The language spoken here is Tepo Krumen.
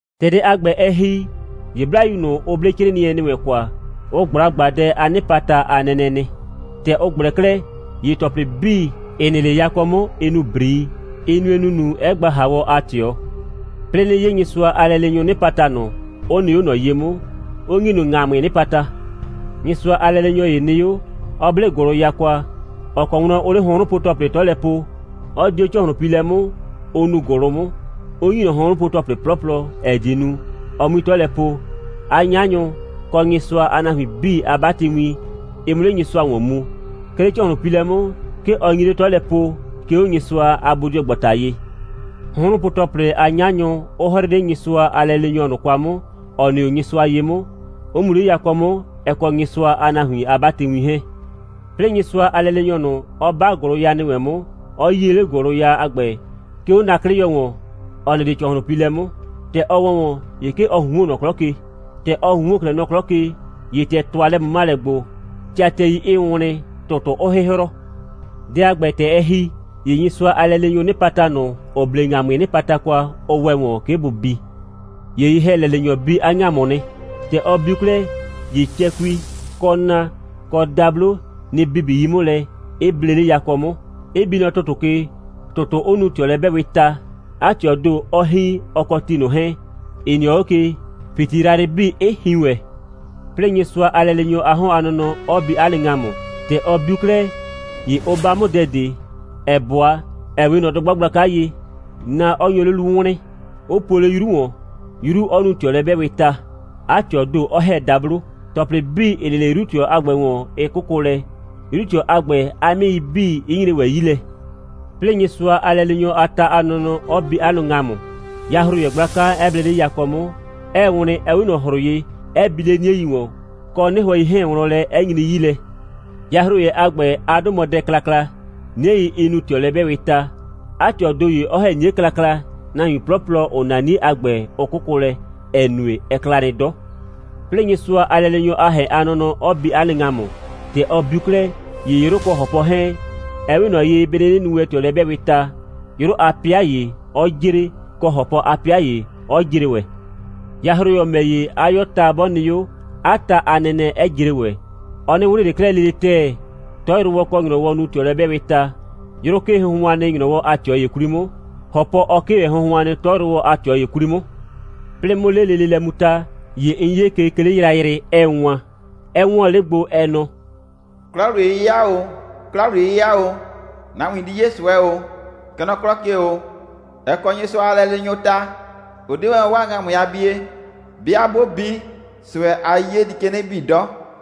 ‑Tɛ dɛ a ‑gbɛ, ɛ ‑hi, ‑ye 'Blayu ꞊nʋ, ‑ʋ 'ble 'crɩɩnɩɛ ‑nɩ wɛn kwa, ʋ ꞊gbla ꞊gbaadɛ a 'nɩpata a nɛnɛ nɩ. ‑Tɛ ʋ ꞊gblɛ 'klɛɛ, ‑ye ‑tɔplɩ 'bii, ‑ɩ nɩ 'le yakɔ 'mʋ, ɩ nu ‑brii. Ɩ nue ‑nunu, 'ɛ gba ‑haawɔ a ꞊tɩɔ. 'Plɩɩ 'nɩ 'ye Nyɩsʋa a lɛleenyʋʋ 'nɩpata ꞊nʋ, ‑ʋ nɩ 'o ꞊nɔ ye 'mʋ, 'ʋ ‑nyi ꞊nʋ ‑ŋamʋɩɩ 'nɩpata. Nyɩsʋa a lɛleenyɔ ‑ye nɩ 'o, 'ɔ 'ble ‑gʋlʋya kwa, ‑ɔ kɔ wlɔn ʋʋ 'le hʋnhrʋnpo‑tɔplɩ 'tɔ lɛ po, 'ɔ di 'o ‑cɔhlʋnpiilɛ 'mʋ, ʋ nuu ‑gʋlʋ 'mʋ, 'ʋ ‑nyi ꞊nɔ hʋnhrʋnpo‑tɔplɩ 'plɔplɔ, ‑ɛ die nu, ɔ 'mui 'tɔ lɛ po, 'a 'nyanyʋ, kɔ Nyɩsʋa a nahuin 'bii a 'batɩwin, ɩ 'mʋ 'le Nyɩsʋa ‑wɔn mu. 'Ke 'le ‑cɔhlʋnpiilɛ 'mʋ, 'ke ɔ nyi 'le 'tɔ lɛ poo, 'ke 'o Nyɩsʋa a bodɩɔgbata ye, hʋnhrʋnpo‑tɔplɩ a 'nyanyʋ 'ʋ 'hrɩɩ 'le Nyɩsʋa a lɛleenyɔ ꞊nʋ kwa 'mʋ, ‑ɔ nɩ 'o Nyɩsʋa ye 'mʋ, 'ʋ mu 'le yakɔ 'mʋ, ɛ kɔ Nyɩsʋa a nahuin a 'batɩwin 'hɛɛn. 'Plɩɩ Nyɩsʋa a lɛleenyɔ ꞊nʋ, 'ɔ 'ba ‑gʋlʋya ‑nɩ wɛn 'mʋ, 'ɔ 'yie 'le ‑gʋlʋya a ‑gbɛ, 'ke 'o na'klɩyɔ ‑wɔn, ‑ɔ nɩ 'le ‑cɔhlʋnpiilɛ 'mʋ. ‑Tɛ ɔ ‑wɛ ‑wɔn, ‑ye 'ke ɔ ꞊hunhuon nɔ 'klɔ ke. ‑Tɛ ɔ ꞊hunhuon 'klɛɛ nɔ 'klɔ ke, ‑ye ‑tɛ ‑tʋa lɛ꞊mʋmalɛ gbo, tɩatɩɛi 'ɩɩ wlɩn, ‑tʋtʋ 'ʋʋ 'hɩhrɔ. Dɛ a ‑gbɛ, ‑tɛ ɛ ‑hi, ‑ye Nyɩsʋa a lɛleenyʋʋ 'nɩpata ꞊nʋ, ‑ʋ 'ble ‑ŋamʋɩɩ 'nɩpata kwa, ʋ ‑wɛ ‑wɔn, 'ke bʋ bi. ‑Ye ye‑hɛlɛleenyɔ bi 'a ‑ŋamʋ nɩ. ‑Tɛ ɔ biu 'klɛɛ, ‑ye cɛkui, kɔ na, kɔ dablo, nɩ‑ bibi 'yi 'mʋ lɛ, 'ɩ ble 'le yakɔ 'mʋ, 'ɩ bi nɔ ‑tʋtʋ ke, ‑tʋtʋ 'ʋ nu ꞊tɩɔlɛ'bɛɛwɩɩ ta, 'a ꞊tɩɔɔ ‑do, 'ɔ hin, ɔ kɔ ti ꞊nʋ 'hɛɛn, ‑ɩ nɩɔ 'o ke, ‑piti yrayrɩ 'bii 'ɩ hin ‑wɛ. 'Plɩɩ Nyɩsʋa a lɛleenyɔ a 'hɔn a nɔnɔ 'ɔ bi 'a nɩ ‑ŋamʋ. ‑Tɛ ɔ biu 'klɛɛ, ‑ye ʋ 'ba 'mʋ dɛ ꞊de, ‑ɛ 'bʋa, ‑ɛ 'we ꞊nɔ dʋgba gblaka ye, na 'ɔ nyo 'o 'lu wlɩɩn, 'ʋ puo 'le 'yru ‑wɔn, 'yru 'ʋ nu ꞊tɩɔlɛ'bɛɛwɩɩ ta, 'a ꞊tɩɔɔ ‑do 'ɔ ‑hɛ dablo, ‑tɔplɩ 'bii, ‑ɩ nɩ 'le 'yru꞊tɩɔ a ‑gbɛ ‑wɔn, 'ɩ 'kʋkʋ lɛ, 'yru꞊tɩɔ a ‑gbɛ a 'mɩɩi 'bii, 'ɩ nyre ‑wɛ 'yi lɛ. 'Plɩɩ Nyɩsʋa a lɛleenyɔ a ta a nɔnɔ 'ɔ bi 'a nɩ ‑ŋamʋ, yahroyɛ gblaka 'ɛ ble 'le yakɔ 'mʋ, 'ɛɛ wlɩn, ‑ɛ 'we ꞊nɔ ‑hrʋ ye, 'ɛ bi 'le 'niei ‑wɔn, kɔ 'nɩhʋɛ 'hɛɛn wlɔn lɛ, 'ɛ nyri 'yi lɛ. Yahroyɛ a ‑gbɛ, 'a 'dʋ mɔ Dɛ Klakla; 'niei 'ɩ nu ꞊tɩɔlɛ'bɛɛwɩɩ ta, 'a ꞊tɩɔɔ ‑do ‑ye, 'ɔ ‑hɛ 'nie klakla, nahuin 'plɔplɔ, ‑ʋ 'na 'nie a ‑gbɛ, 'ʋ 'kʋkʋ lɛ, ‑ɛ nue, ɛ kla nɩ 'dɔ. 'Plɩɩ Nyɩsʋa a lɛleenyɔ a ‑hɛn a nɔnɔ 'ɔ bi 'a nɩ ‑ŋamʋ. ‑Tɛ ɔ biu 'klɛɛ, ‑ye 'yrʋ kɔ ‑hɔpɔ 'hɛɛn, ɛ 'we ꞊nɔ ye, bɩ 'nɩnɩ nu wɛn ꞊tɩɔlɛ'bɛɛwɩɩ ta, 'yrʋ a 'pɩa ‑ye 'ɔ jre, kɔ, ‑hɔpɔ a 'pɩa ‑ye 'ɔ jre ‑wɛ. Yahroyɔ ‑mɛ ‑ye, 'a 'yɔɔ ta 'bɔ nɩ 'o, 'a ta a nɛnɛ 'ɛ jre ‑wɛ. Ɔ 'nɩ wlɩn ꞊le 'klɛɛ lele ‑tɛɛ. 'Tɔyrʋwɔ kɔ ‑nyrɔwɔ nu ꞊tɩɔlɛ'bɛɛwɩɩ ta. 'Yrʋ 'kee hʋnhʋan nɩ, ‑nyrɔwɔ a ꞊tɩɔ ‑ye 'kwli 'mʋ, ‑hɔpɔ 'ɔ 'kee ‑wɛ hʋnhʋan, 'tɔyrʋwɔ a ꞊tɩɔ ‑ye 'kwli 'mʋ. 'Plɩɩ 'mʋ 'le lele lɛ mu ta, ‑ye 'n 'ye ke, 'ke 'le yrayrɩ, 'ɛɛ wan, 'ɛ 'wɔɔn 'le gbo, ɛ nɔ: «'Kla‑wliye'yɩya ‑o, 'kla‑wliye'yɩya ‑o. Nahuin di 'ye ꞊sʋɛ ‑o, kɛ nɔ 'klɔ ke ‑o. Ɛ kɔ Nyɩsʋa a lɛleenyʋʋ ta, 'ʋ 'de wɛn 'waa ‑ŋamʋɩ a bie. 'Bɩa 'bʋ bi, ꞊sʋɛ a 'yiye di ke 'nɩ bii 'dɔ.»